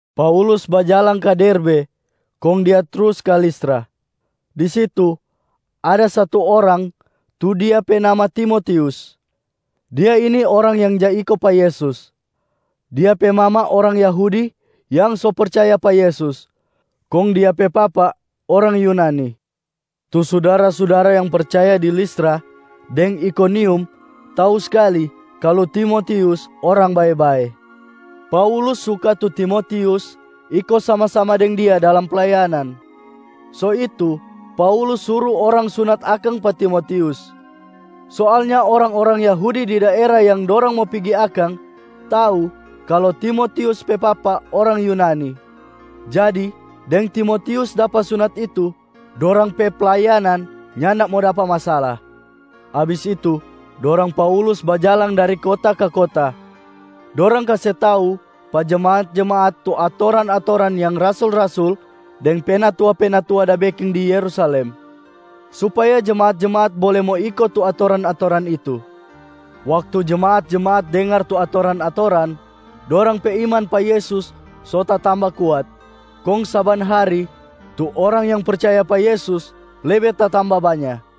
Paulus bajalang ka Derbe kong dia trus ka Listra. Di situ, ada satu orang tu dia pe nama Timotius, dia ini orang yang ja iko pa Yesus. Dia pe mama orang Yahudi yang so percaya pa Yesus, kong dia pe papa orang Yunani. Tu sudara-sudara yang percaya di Listra deng Ikonium tau skali kalu Timotius orang bae-bae. Paulus suka tu Timotius iko sama-sama deng dia dalam playanan, so itu Paulus suru orang sunat akang pa Timotius. Soalnya orang-orang Yahudi di daera yang dorang mo pigi akang tau kalu Timotius pe papa orang Yunani, jadi deng Timotius dapa sunat itu, dorang pe playanan nyanda mo dapa masala. Abis itu dorang Paulus bajalang dari kota ka kota. Dorang kase tau pa jemaat-jemaat tu atoran-atoran yang rasul-rasul deng penatua-penatua da beking di Yerusalem, supaya jemaat-jemaat bole mo iko tu atoran-atoran itu. Waktu jemaat-jemaat dengar tu atoran-atoran, dorang pe iman pa Yesus so tatamba kuat, kong saban hari tu orang yang percaya pa Yesus lebe tatamba banya.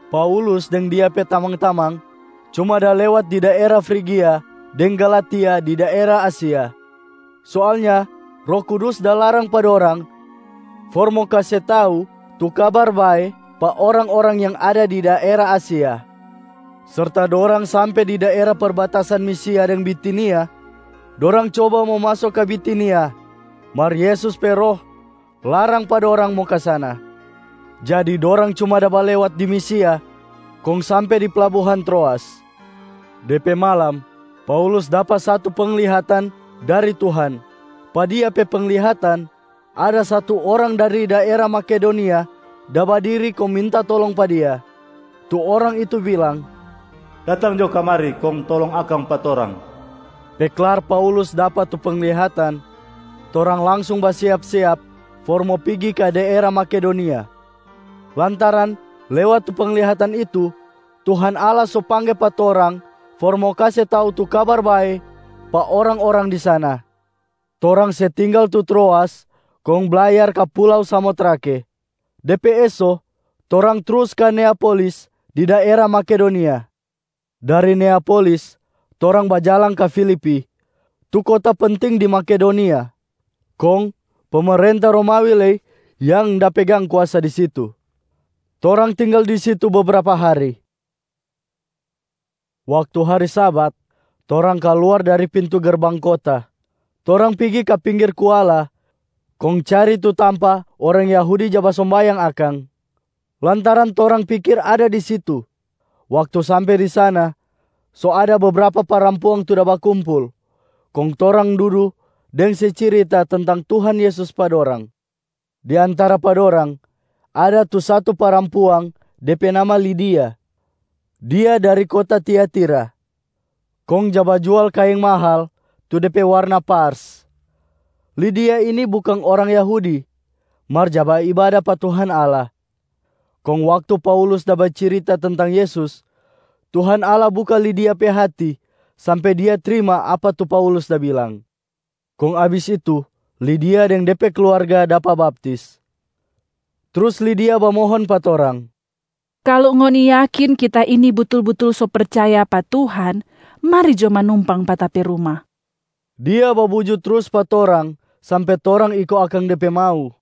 Paulus deng dia pe tamang-tamang cuma da lewat di daera Frigia deng Galatia di daera Asia. Soalnya Roh Kudus da larang pa dorang for mo kase tau tu Kabar Bae pa orang-orang yang ada di daera Asia. Serta dorang sampe di daera perbatasan Misia deng Bitinia, dorang coba mo maso ka Bitinia mar Yesus pe Roh larang pa dorang mo ka sana. Jadi dorang cuma da balewat di Misia kong sampe di plabuhan Troas. De pe malam, Paulus dapa satu penglihatan dari Tuhan. Pa dia pe penglihatan, ada satu orang dari daera Makedonia da badiri kong minta tolong pa dia. Tu orang itu bilang, “Datang jo kamari kong tolong akang pa torang.” Pe klar Paulus dapa tu penglihatan, torang langsung basiap-siap for mo pigi ka daera Makedonia, lantaran lewat tu penglihatan itu Tuhan Allah so pangge pa torang for mo kase tau tu Kabar Bae pa orang-orang di sana. Torang se tinggal tu Troas kong blayar ka pulau Samotrake. De pe eso, torang trus ka Neapolis di daera Makedonia. Dari Neapolis torang bajalang ka Filipi, tu kota penting di Makedonia, kong pemerenta Romawi lei yang da pegang kuasa di situ. Torang tinggal di situ bebrapa hari. Waktu hari Sabat, torang kaluar dari pintu gerbang kota. Torang pigi ka pinggir kuala kong cari tu tampa orang Yahudi ja basombayang akang, lantaran torang pikir ada di situ. Waktu sampe di sana, so ada bebrapa parampuang tu da bakumpul, kong torang dudu deng se cirita tentang Tuhan Yesus pa dorang. Di antara pa dorang, ada tu satu parampuang, de pe nama Lidia. Dia dari kota Tiatira, kong ja bajual kaeng mahal tu de pe warna pars. Lidia ini bukang orang Yahudi mar ja baibada pa Tuhan Allah. Kong waktu Paulus da bacirita tentang Yesus, Tuhan Allah buka Lidia pe hati sampe dia trima apa tu Paulus da bilang. Kong abis itu Lidia deng de pe kluarga dapa baptis. Trus Lidia bamohon pa torang, “Kalu ngoni yakin kita ini butul-butul so percaya pa Tuhan, mari jo manumpang pa ta pe ruma.” Dia babuju trus pa torang sampe torang iko akang de pe mau.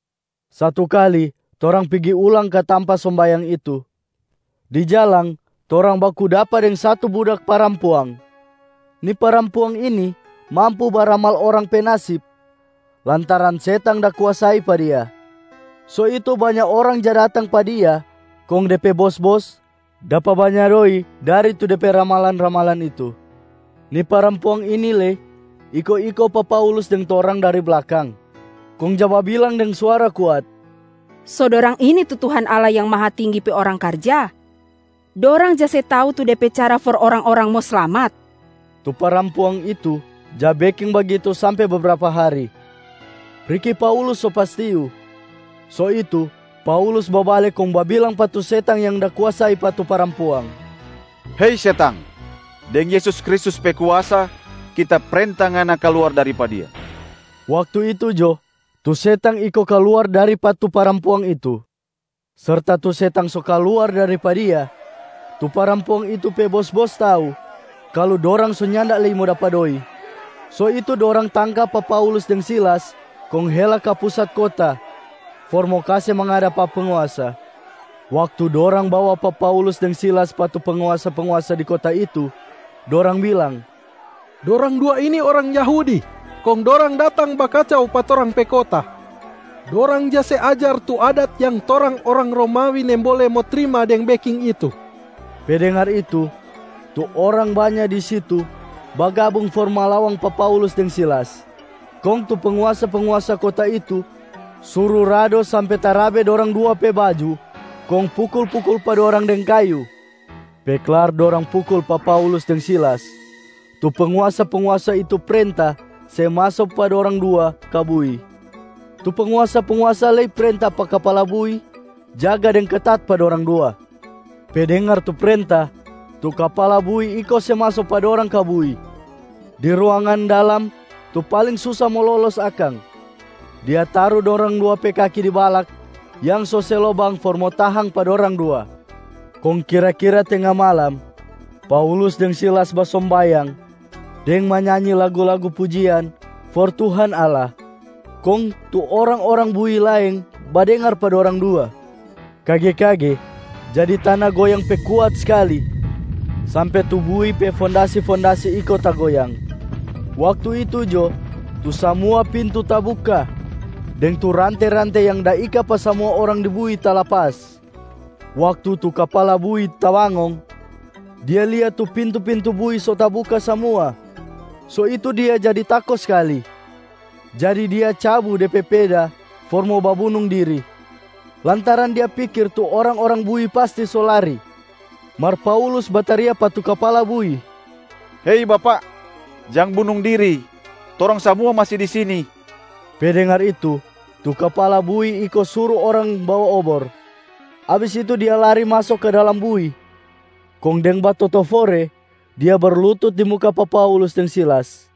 Satu kali, torang pigi ulang ka tampa sombayang itu. Di jalang torang baku dapa deng satu budak parampuang. Ni parampuang ini mampu baramal orang pe nasib lantaran setang da kuasai pa dia. So itu banya orang ja datang pa dia kong de pe bos-bos dapa banya doi dari tu de pe ramalan-ramalan itu. Ni parampuang ini lei iko-iko pa Paulus deng torang dari blakang kong ja babilang deng suara kuat, “So dorang ini tu Tuhan Allah yang Mahatinggi pe orang karja. Dorang ja se tau tu de pe cara for orang-orang mo slamat.” Tu parampuang itu ja beking bagitu sampe bebrapa hari, riki Paulus so pastiu. So itu Paulus babale kong babilang pa tu setang yang da kuasai pa tu parampuang, “Hei setang! Deng Yesus Kristus pe kuasa, kita prenta ngana kaluar dari pa dia.” Waktu itu jo, tu setang iko kaluar dari pa tu parampuang itu. Serta tu setang so kaluar dari pa dia, tu parampuang itu pe bos-bos tau kalu dorang so nyanda lei mo dapa doi. So itu dorang tangka pa Paulus deng Silas kong hela ka pusat kota for mo kase mangada pa penguasa. Waktu dorang bawa pa Paulus deng Silas pa tu penguasa-penguasa di kota itu, dorang bilang, “Dorang dua ini orang Yahudi, kong dorang datang bakacau pa torang pe kota. Dorang ja se ajar tu adat yang torang orang Romawi nimbole mo trima deng beking itu.” Pe dengar itu, tu orang banya di situ bagabung for malawang pa Paulus deng Silas. Kong tu penguasa-penguasa kota itu suru rado sampe tarabe dorang dua pe baju kong pukul-pukul pa dorang deng kayu. Pe klar dorang pukul pa Paulus deng Silas, tu penguasa-penguasa itu prenta se maso pa dorang dua ka bui. Tu penguasa-penguasa lei prenta pa kapala bui jaga deng ketat pa dorang dua. Pe dengar tu prenta, tu kapala bui iko se maso pa dorang ka bui, di ruangan dalam tu paling susa mo lolos akang, dia taru dorang dua pe kaki di balak yang so se lobang for mo tahang pa dorang dua. Kong kira-kira tenga malam, Paulus deng Silas basombayang deng manyanyi lagu-lagu pujian for Tuhan Allah, kong tu orang-orang bui laeng badengar pa dorang dua. Kage-kage jadi tana goyang pe kuat skali sampe tu bui pe fondasi-fondasi iko tagoyang. Waktu itu jo, tu samua pintu tabuka deng tu rante-rante yang da ika pa samua orang di bui talapas. Waktu tu kapala bui tabangong, dia lia tu pintu-pintu bui so tabuka samua. So itu dia jadi tako skali, jadi dia cabu de pe peda for mo babunung diri, lantaran dia pikir tu orang-orang bui pasti so lari. Mar Paulus bataria pa tu kapala bui, “Hei bapak! Jang bunung diri! Torang samua masi di sini.” Pe dengar itu, tu kapala bui iko suru orang bawa obor. Abis itu dia lari maso ka dalam bui, kong deng batotofore dia berlutut di muka pa Paulus deng Silas.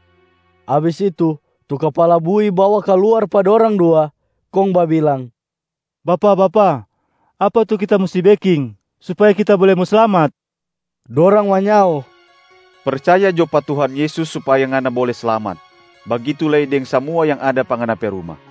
Abis itu tu kapala bui bawa kaluar pa dorang dua, kong babilang, “Bapak-bapak, apa tu kita musti beking supaya kita bole mo slamat?” Dorang manyao, “Percaya jo pa Tuhan Yesus supaya ngana bole slamat, bagitu lei deng samua yang ada pa ngana pe ruma.”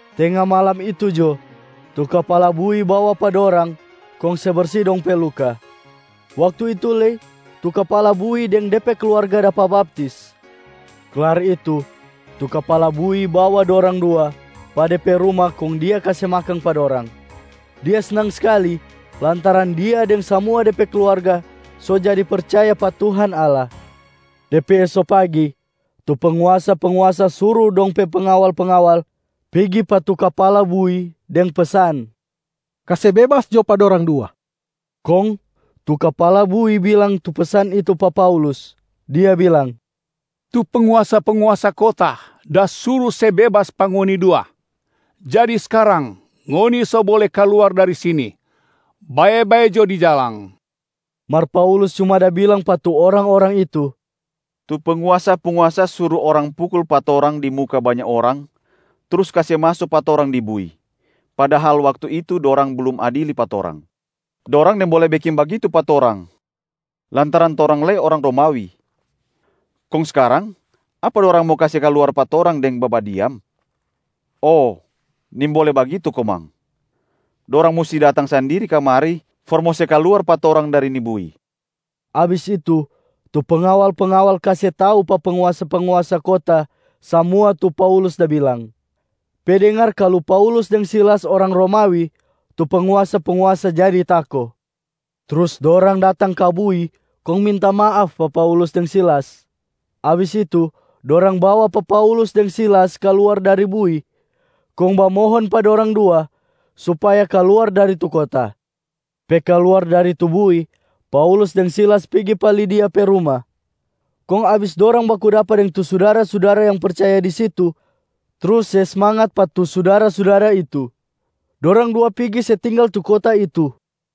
Tenga malam itu jo, tu kapala bui bawa pa dorang kong se bersi dong pe luka. Waktu itu lei tu kapala bui deng de pe kluarga dapa baptis. Klar itu, tu kapala bui bawa dorang dua pa de pe ruma kong dia kase makang pa dorang. Dia snang skali lantaran dia deng samua de pe kluarga so jadi percaya pa Tuhan Allah. De pe eso pagi, tu penguasa-penguasa suru pa dong pe pengawal-pengawal pigi pa tu kapala bui deng pesan, “Kase bebas jo pa dorang dua!” Kong tu kapala bui bilang tu pesan itu pa Paulus, dia bilang, “Tu penguasa-penguasa kota da suru se bebas pa ngoni dua. Jadi skarang, ngoni so bole kaluar dari sini. Bae-bae jo di jalang!” Mar Paulus cuma da bilang pa tu orang-orang itu, “Tu penguasa-penguasa suru orang pukul pa torang di muka banya orang trus kase maso pa torang di bui, padahal waktu itu dorang blum adili pa torang. Dorang nimbole beking bagitu pa torang lantaran torang lei orang Romawi. Kong skarang, apa dorang mo kase kaluar pa torang deng babadiam? Oh, nimbole bagitu komang! Dorang musti datang sandiri kamari for mo se kaluar pa torang dari ni bui.” Abis itu, tu pengawal-pengawal kase tau pa penguasa-penguasa kota samua tu Paulus da bilang. Pe dengar kalu Paulus deng Silas orang Romawi, tu penguasa-penguasa jadi tako. Trus dorang datang ka bui kong minta maaf pa Paulus deng Silas. Abis itu, dorang bawa pa Paulus deng Silas kaluar dari bui kong bamohon pa dorang dua supaya kaluar dari tu kota. Pe kaluar dari tu bui, Paulus deng Silas pigi pa Lidia pe ruma. Kong abis dorang baku dapa deng tu sudara-sudara yang percaya di situ trus se smangat pa tu sudara-sudara itu, dorang dua pigi se tinggal tu kota itu.